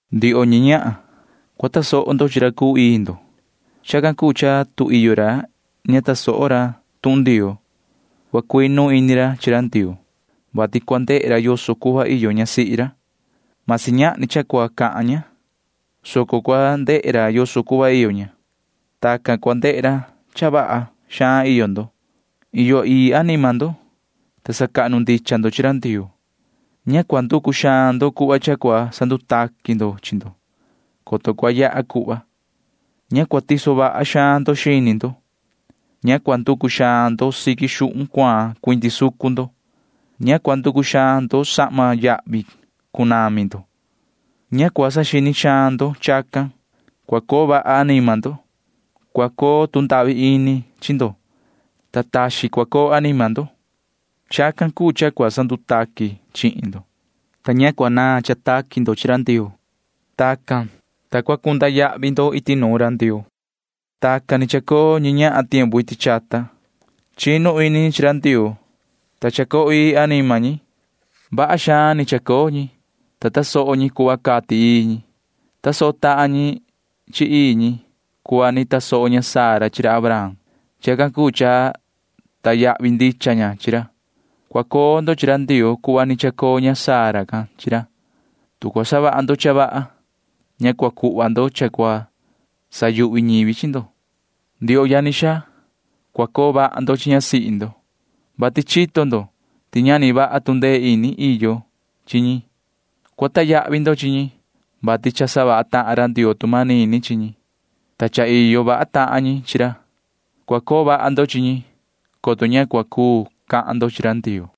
Ndioho ñi ñahan, cua tasoho ndo chi ra cuu ii ndo. Chacan cuu cha tu iyo ra ña ta tasoho ra tuhun Ndioo, cua cuinu ini ra chi ra Ndioo, vati cua ndehe ra yoso cuhva iyo ñasihi ra. Vasi ñahni cha cua cahan ña, soco cua ndehe ra yoso cuhva iyo ña. Tacan cua ndehe ra cha vaha xaan iyo ndo. Iyo ii anima ndo, ta sacahnu ndicha ndo chi ra Ndioo. Ña cua nducu xaan ndo cuhva cha cua ndutaqui xaan ndo, coto cua yaha cuhva. Ña cua tiso vaha xaan ndo xini ndo. Ña cua nducu xaan ndo siqui xuhun cuaan cuindi sucun ndo. Ña cua nducu xaan ndo sahma yahvi xaan cunami ndo. Ña cua saxini xaan ndo chacan, soco cua coo vaha ndo chi anima ndo. Cua cundahvi ini ndo, ta taxin cua coo anima ndo. Tacan ni cua ndutaqui ndo, ta ña cua naan cha taqui ndo chi ra Ndioo. Tacan, ta cua cunda yahvi ndo iti nuun ra Ndioo. Tacan ni chacoo ñi ñahan iti chata tiempu chahnu. Chinu ini ñi chi ra Ndioo, ta cha iyo ii anima ñi. Vaha xaan ni chacoo ñi, ta tasoho ñi cuhva cati ii ñi. Tasoho tahan ñi chi ii ñi cuhva ni tasoho ña Sara chi ra Abraham. Chacan cuu cha sacahnu ndicha ña chi ra. Cua coo ndo chi ra Ndioo sava cuhva ni chacoo maan ña Sara can chi ra, tu cua savaha ndo cha vaha, ta ña cua cuhva ndo cha cua sayuhvi ñivi chi ndo. Ndioho yani xaa, cua coo vaha ndo chi ñasihi ndo, vati chito ndo ti ñahni vaha tu ndee ini iyo chi ñi. Cua sacahnu ndo chi ñi, vati cha savaha tahan ra Ndioo tu manini chi ñi, ta cha iyo vaha tahan ñi chi ra. Cua coo vaha ndo chi ñi, coto ña cua cuu cahan ndo chi ra Ndioo.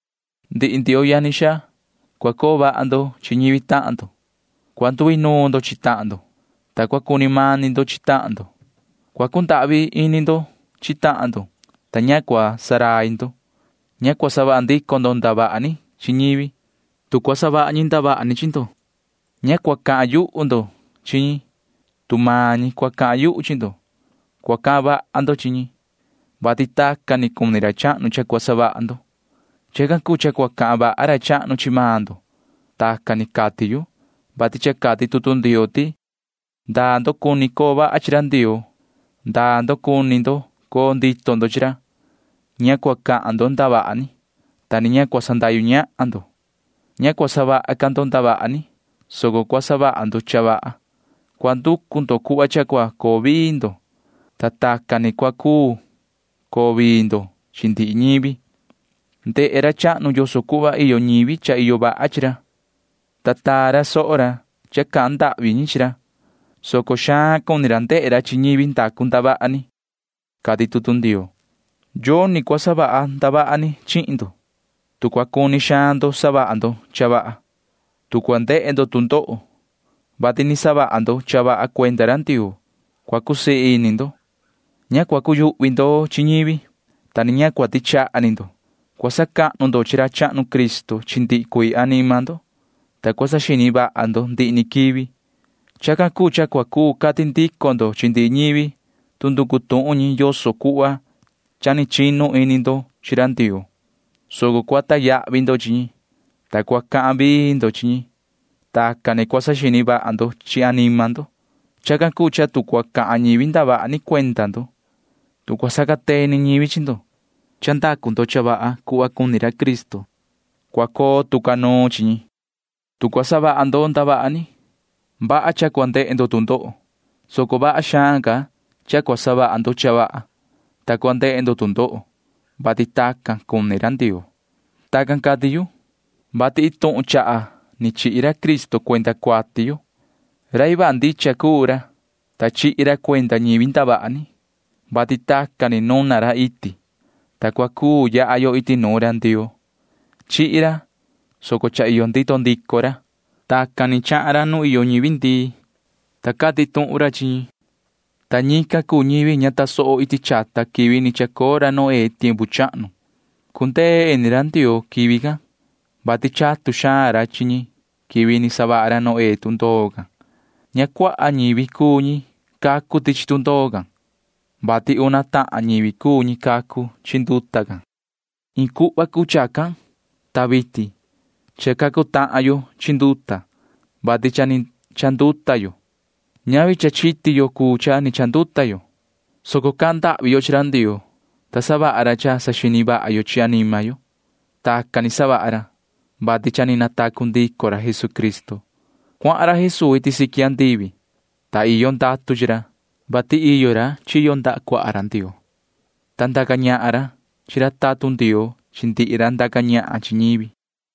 Ndihi ndioho yani xaa, cua coo vaha ndo chi ñivi tahan ndo. Cua nduinuun ndo chi tahan ndo, ta cua cuni mani ndo chi tahan ndo. Cua cundahvi ini ndo chi tahan ndo, ta ña cua ndurai ndo. Ña cua savaha ndico ndo ndavaha ni chi ñivi, tu cua savaha xihna ñi ndavaha ni chi maan ndo. Ña cua cahan yuhu ndico ndo, tu cua cahan yuhu xihna ñivi chi maan ndo. Cua cahan vaha ndo chi ñican, vati tacan ni cuni ra chahnu cha cua savaha ndo. Chacan cuu cha cua cahan vaha ra chahnu chi maan ndo. Tacan ni cati yu, vati cha cati tutu Ndioo ti: Ndaa ndo cuni ndo coo vaha ndo chi ra Ndioo, ndaa ndo cuni ndo coo ndito ndo chi ra, ña cua cahan ndo ndavaha ni, ta ni ña cua sandahyu ñahan ndo. Ña cua savaha ca ndo ndavaha ni, soco cua savaha ndo cha vaha. Cua nducu ndo cuhva cha cua coo vii ndo, ta tacan ni cua cuu coo vii ndo chi ndihi ñivi. Ndehe ra chahnu yoso cuhva iyo ñivi cha iyo vaha chi ra, ta taa vaha ra soho ra cha cahan ndahvi ñi chi ra, soco xaan cuni ra ndehe ra chi ñivi ndacu ndavaha ni, cati tutu Ndioo. Yoni cua savaha ndavaha ni chihin ndo, tu cua cuni xaan ndo savaha ndo cha vaha. Tu cua ndehe ndo tu ndoho, vati ni savaha ndo cha vaha cuenda ra Ndioo, cua cusii ini ndo. Ña cua cuyuhvi ndo chi ñivi, ta ni ña cua tichaha ni ndo. Cua sacahnu ndo chi ra chahnu Cristo chi ndihi cuii anima ndo, ta cua saxini vaha ndo ndihi ni quivi. Chacan cuu cha cua cuu cati ndico ndo chi ndihi ñivi chica tuhun chi ndo yoso cuhva cha chinu ini ndo chi ra Ndioo, soco cua sacahnu vaha ndo chi ñi, ta cua cahan vii ndo chi ñi. Tacan ni cua saxini vaha ndo chi anima ndo. Chacan cuu cha tu cua cahan ñivi ndavaha ni cuenda ndo, tu cua sacateni ñivi chi ndo, ta ndacu ndo cha vaha cuhva cuni ra Cristo, cua coo tu ca nuun chi ñi. Tu cua savaha ndo ndavaha ni, vaha cha cua ndehe ndo tu ndoho, soco vaha xaan ca cha cua savaha ndo cha vaha, ta cua ndehe ndo tu ndoho, tu tacan ni cua cuni ra Ndioo. Tacan cati yu, vati iin tuhun ni chaha ni chihi ra Cristo cuenda cuati yo. Rai vaha ndicha cuu ra, ta chihi ra cuenda ñivi ndavaha ni, vati tacan ni nuna ra iti, ta cua cuu yaha yo iti nuun ra Ndioo. Chihi ra, soco cha iyo ndito ndico ra. Tacan ni cuahan ra nu iyo ñivi ndii, ta cati tuhun ra chi ñi, ta ñican cuu ñivi ña tasoho iti chata quivi ni chacoo ra Noé tiempu chahnu. Cundee ini ra Ndioo quivi can, vati chatu xaan ra chi ñi quivi ni savaha ra Noé tundoo can. Ña cuaha ñivi cuu ñi cacu tichi tundoo can, vati una tahan ñivi cuu ñi cacu chi nduta can. Iin cuhva cuu chacan, ta vitin cha cacu tahan yo chi nduta, vati cha ni chanduta yo. Ñavi cha chiti yo cuu cha ni chanduta yo, soco cahan ndahvi yo chi ra Ndioo, ta savaha ra cha saxini vaha yo chi anima yo. Tacan ni savaha ra, vati cha ni natacu ndico ra Jesucristo. Cuahan ra Jesuu iti siqui andivi, ta iyo ndatu chi ra, vati iyo ra chiyo ndaha cuaha ra Ndioo, ta ndaca ñahan ra chi ra tatun Ndioo chi ndihi ra ndaca ñahan chi ñivi.